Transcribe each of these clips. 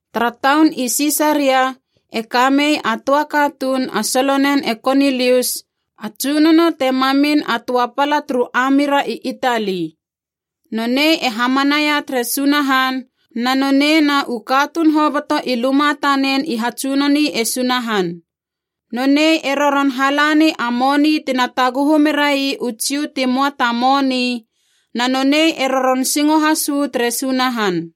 Tara taun i Sisaria e ka mei a töa katuun a solonen e Konilius, a tsunono te mamin a töa pala turu ami ra i Itali. Nonei e hamanaia tere Sunahan, na nonei na u katuun hoboto i luma tanen i hatsunoni e Sunahan. Nonei e roron hala ni a moni tina taguhu merai u Jiu ti möa ta moni, na nonei e roron singo has uu tere Sunahan.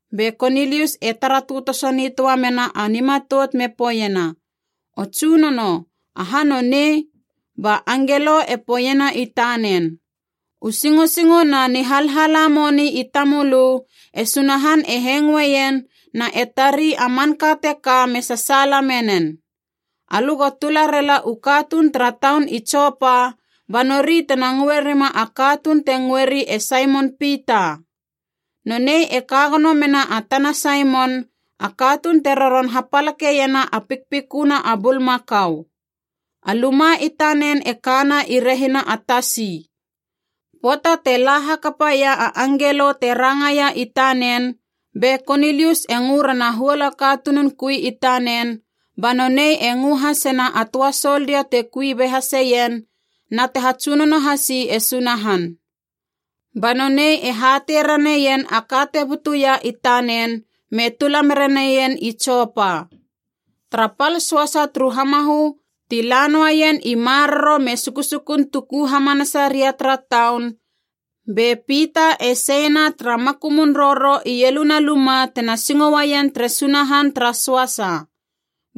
Be Konilius e tara tötoso nitöa mena a nimatout me poeiena, “O tsunono, aha nonei?” Ba angelo e poeiena i tanen, “U singosingo na nihalhala moni i tamölö, e Sunahan e hengoeien na e tari a manka teka me sasaala menen. Alö go tula rela u katuun tara taun i Jopa, ba nori tena ngöe rima a katuun te ngöeri e Saimon Pita. Nonei e ka gono mena a tana Saimon, a katuun te roron hapalakeiena a pikpiköna a bulmakau. A luma i tanen e kana i rehina a tasi.” Pöata te la hakapaia a angelo te rangaia i tanen be Konilius e ngö rena a huol katunun kui i tanen, ba nonei e ngö hasena a töa soldia te kui be haseien na te hatsunono hasi e Sunahan. Ba nonei e hatei raneien a ka te butuia i tanen me tula mera neien i Jopa. Tara pal söasa turu hamahö ti la noaien i maroro me sukusukun tuku hamanasaria tara taun, be Pita e seina tara makumun roro ieluna luma tena singo uaien tere Sunahan tara söasa.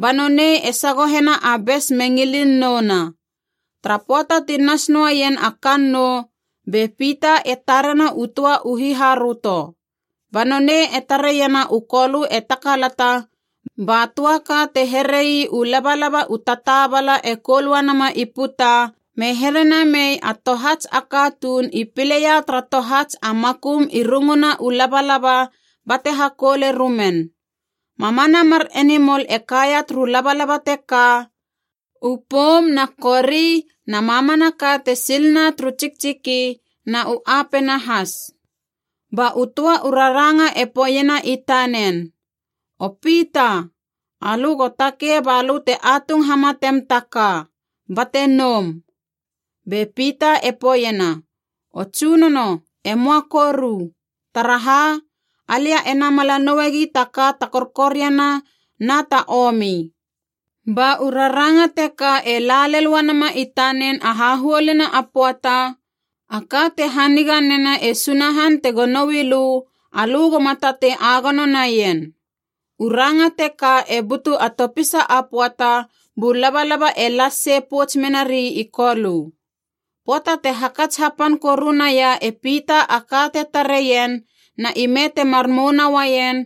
Ba nonei e sagohena a bes me ngilin nouna. Tara pöata ti nas noeien a kannou, be Pita e tarena u töa u hiharöto. Ba nonei e tareiena u Kolö e takalata, ba töa ka te here ii u labalaba u tataabala e koul uanama i puta, me here namei a tohats a katuun i pileia tara tohats a makum rungu na u labalaba bate hakoule rumen. Mamana mar enimol e kaia turu labalaba teka, u poum na kori na mamanaka te silna turu tsiktsiki na u apena has. Ba u töa u raranga e poeiena i tanen, “O Pita, alö go takei balö te atung hamatem ta ka, bate noum!” Be Pita e poeiena, “O Tsunono, e möa koru! Taraha, alia e namala nouegi ta ka ta korkoriana na ta omi.” Ba u raranga teka e la lel uanama i tanen a hahuoluna a pöata, “A ka te haniga nena e Sunahan tego noui lö, alö goma tatei agono naien.” U ranga teka e butu a topisa a pöata bu labalaba e las sei pouts menari i Kolö. Pöata te hakats hapan koru naia e Pita a ka te tareien na ime temar mouna uaien,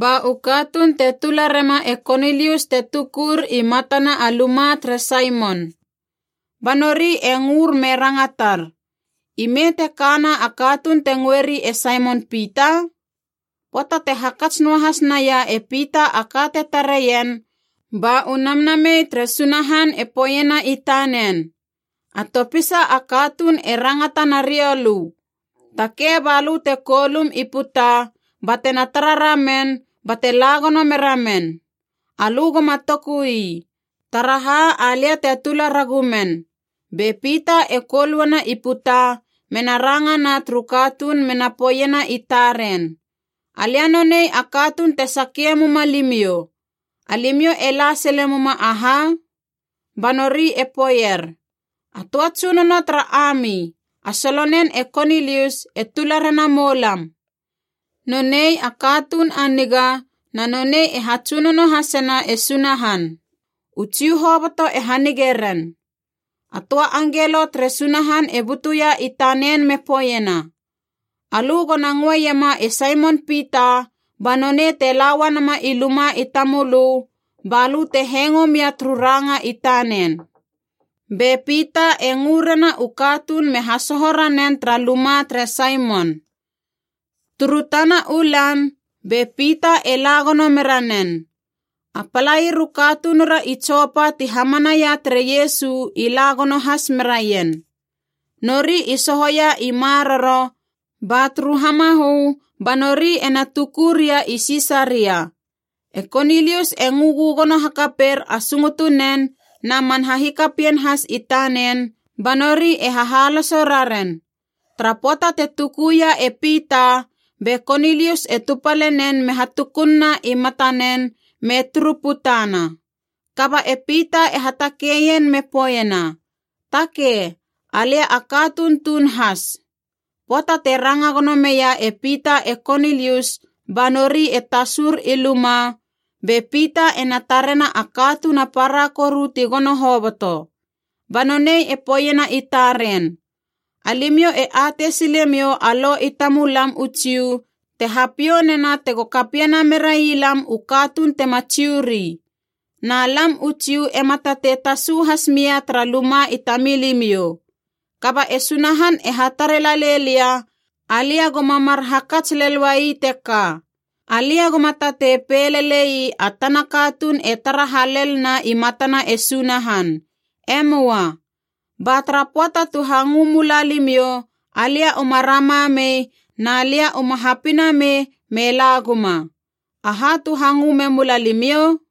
ba u katuun te tula rema e Konilius te tukur i matana a luma tere Saimon. Ba nori e ngör me rangatar, “Ime te kana a katuun te ngöeri e Saimon Pita?” Pöata te hakats noahas naia e Pita a ka te tareien, ba u Namnamei tere Sunahan e poeiena i tanen, “A topisa a katuun e rangata na riou lö. Takei balö te koulum i puta batena tara ramen bate la gono mera men. Alö goma toku ii, taraha alia te tula ragu men.” Be Pita e koul uana i puta mena rangana turu katuun mena poeiena i taren, “Alia nonei a katuun te sakie muma limiou. Alimiou e la sile muma aha?” Ba nori e poeier, “A töa tsunono tara ami, a solonen e Konilius, e tula rena moulam. Nonei a katuun a niga na nonei e hatsunono hasena e Sunahan, u Jiu hoboto e hanige ren. A töa angelo tere Sunahan e butuia i tanen me poeiena, ‘Alö gona ngöeiema e Saimon Pita ba nonei te la uanama i luma i tamölö, balö te hengo mia turu ranga i tanen.’” Be Pita e ngö rena u katuun me hasoho ranen tara luma tere Saimon. Turu tana u lan be Pita e la gono mera nen. A palair u katunura i Jopa ti hamanaia tere Iesu i la gono has meraien. Nori i sohoia i maroro, ba turu hamahö ba nori ena tuku ria i Sisaria. E Konilius e ngö gögono hakaper a sungutu nen na man hahikapien has i tanen, ba nori e hahaloso raren. Tara pöata te tukuia e Pita, be Konilius e tupale nen me hatukunna i matanen me turu putana. Kaba e Pita e hatakeien me poeiena, “Takei, alia a katuun tuun has.” Pöata te ranga gono meia e Pita e Konilius ba nori e tasur i luma, be Pita ena tarena a katuun a para koru ti gono hoboto. Ba nonei e poeiena i taren, “Alimiou e atei silemiou a Lo i tamulam u Jiu te hapiou nena tego kapiena merai lam u katuun tema Jiu ri. Na lam u Jiu ema tatei tasu has mia tara luma i tamilimiou. Kaba e Sunahan e hatare lalei lia, alia goma mar hakats lel uai teka. Alia goma tatei pei lelei a tana katuun e tara halel na i matana e Sunahan. E möa. Ba tara pöata tu hangö mula limiou, alia uma rama mei na lia uma hapinamei me la guma. Aha tu hangö me mula limiou?”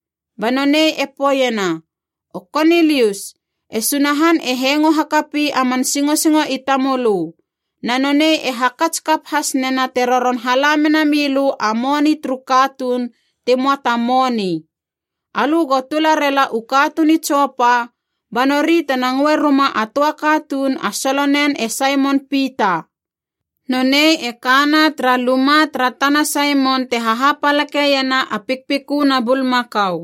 Ba nonei e poeiena, ‘O Konilius, e Sunahan e hengo hakapi a man singosingo i tamölö, na nonei e hakats kap has nena te roron hala mena milö a moni turu katuun ti möa ta moni. Alö go tula rela u katuun i Jopa ba nori tena ngöe ruma a töa katuun a solonen e Saimon Pita. Nonei e kana tara luma tara tana Saimon te hahapalakeiena a pikpiköna bulmakau.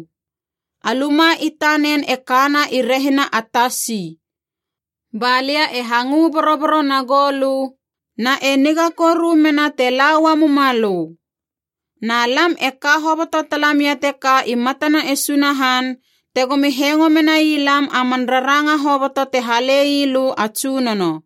A luma i tanen e kana i rehina a tasi.’ Ba lia e hangö boroboro na goulö, na e niga koru mena te la ua mumalö. Na lam e ka hoboto talamia teka i matana e Sunahan, tegomi hengo menai lam a man raranga hoboto te hale ii lö a Tsunono.”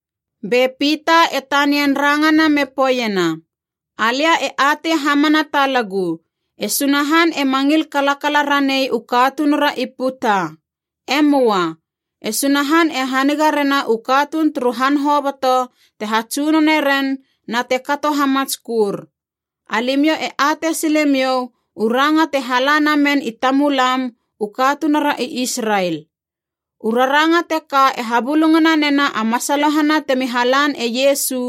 Be Pita e tanian rangana me poeiena, “Alia e atei hamana talagu, e Sunahan ema ngil kalakala ranei u katunura i puta. E möa. E Sunahan e haniga rena u katuun turu han hoboto te hatsunone ren na te kato hamatskör. Alimiou e atei silemiou u ranga te hala namen i tamulam u katunura i Israel. U raranga teka e habulungana nena a masalohana temi halan e Iesu,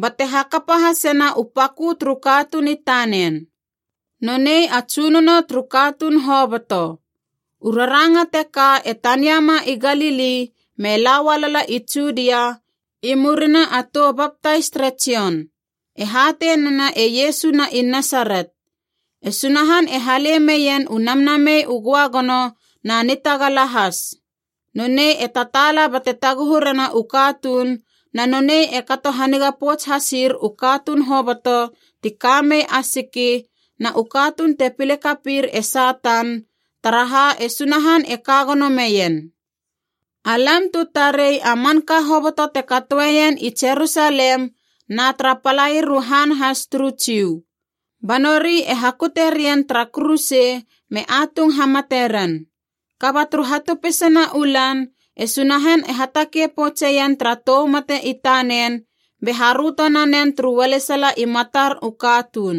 bate hakapa hasena u pakö turu katuun i tanen. Nonei a tsunono turu katuun hoboto. U raranga teka e taniama i Galili me la ualala i Judia i murina a tou baptais tere Jon. E hatei nena e Iesu na i Nasaret. E Sunahan e hale meien u Namnamei u Göagono na nitagala has. Nonei e tataala bate taguhu rena u katuun na nonei e kato haniga pouts hasir u katuun hoboto ti ka mei a siki na u katuun te pile kapir e Satan, taraha e Sunahan e ka gono meien. “Alam tu tarei a manka hoboto te katoeien i Jerusalem na tara palair u han has turu Jiu. Ba nori e hakute rien tara kuruse me atung hamate ren. Kaba turu hatopisana u lan e Sunahan e hatakei poutseien tara tou mate i tanen, be haröto nanen turu ualesala i matar u katuun.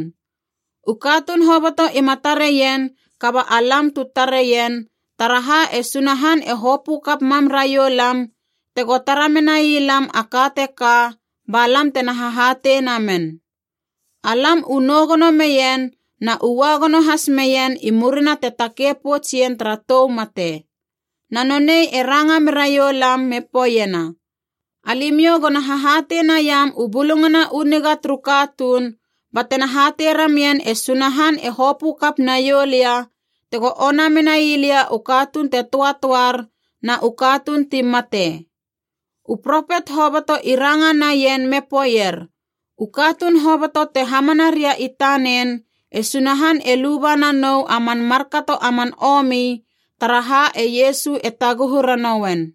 U katuun hoboto ima tareien kaba alam tu tareien, taraha e Sunahan e hopö kap mam raiou lam tego tara menai lam a ka teka ba lam tena hahatei namen. Alam u nou gono meien na u ua gono has meien i murina te takei pouts ien tara tou mate. Na nonei e ranga meraiou lam me poeiena, ‘Alimiou gona hahatei naiam u Bulungana u Niga turu katuun, ba tena hatei ramien e Sunahan e hopö kap naiou lia tego ona menai lia u katuun te töatöar na u katuun ti mate.’ U propet hoboto i ranga naien me poeier u katuun hoboto te hamana ria i tanen, e Sunahan e luba nanou a man markato a man omi, taraha e Iesu e taguhu ranouen.”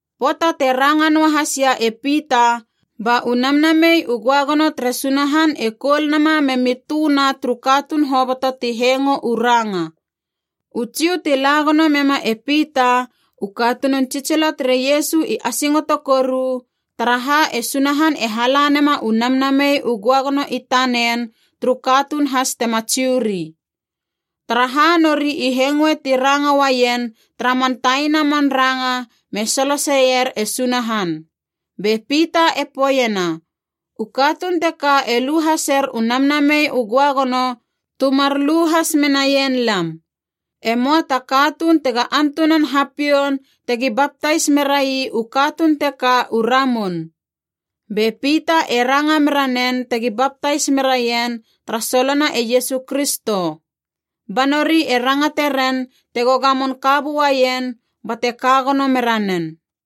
Pöata te ranga noahasia e Pita ba u Namnamei u Göagono tere Sunahan e koul nama memi tö na turu katuun hoboto ti hengo u ranga. U Jiu ti la gono mema e Pita u katunun tsitsilo tere Iesu i asingoto koru, taraha e Sunahan e hala nema u Namnamei u Göagono i tanen turu katuun has tema Jiu ri. Taraha nori i hengoe ti ranga uaien tara man taina man ranga me soloseier e Sunahan. Be Pita e poeiena, “U katuun teka e lu haser u Namnamei u Göagono tu mar lu has menaien lam. E möa ta katuun tega antunan hapioun tegi baptais merai u katuun teka u ramun,” Be Pita e ranga mera nen tegi baptais meraien tara solona e Iesu Kristo. Ba nori e rangate ren tego gamon ka buaien bate ka gono mera nen.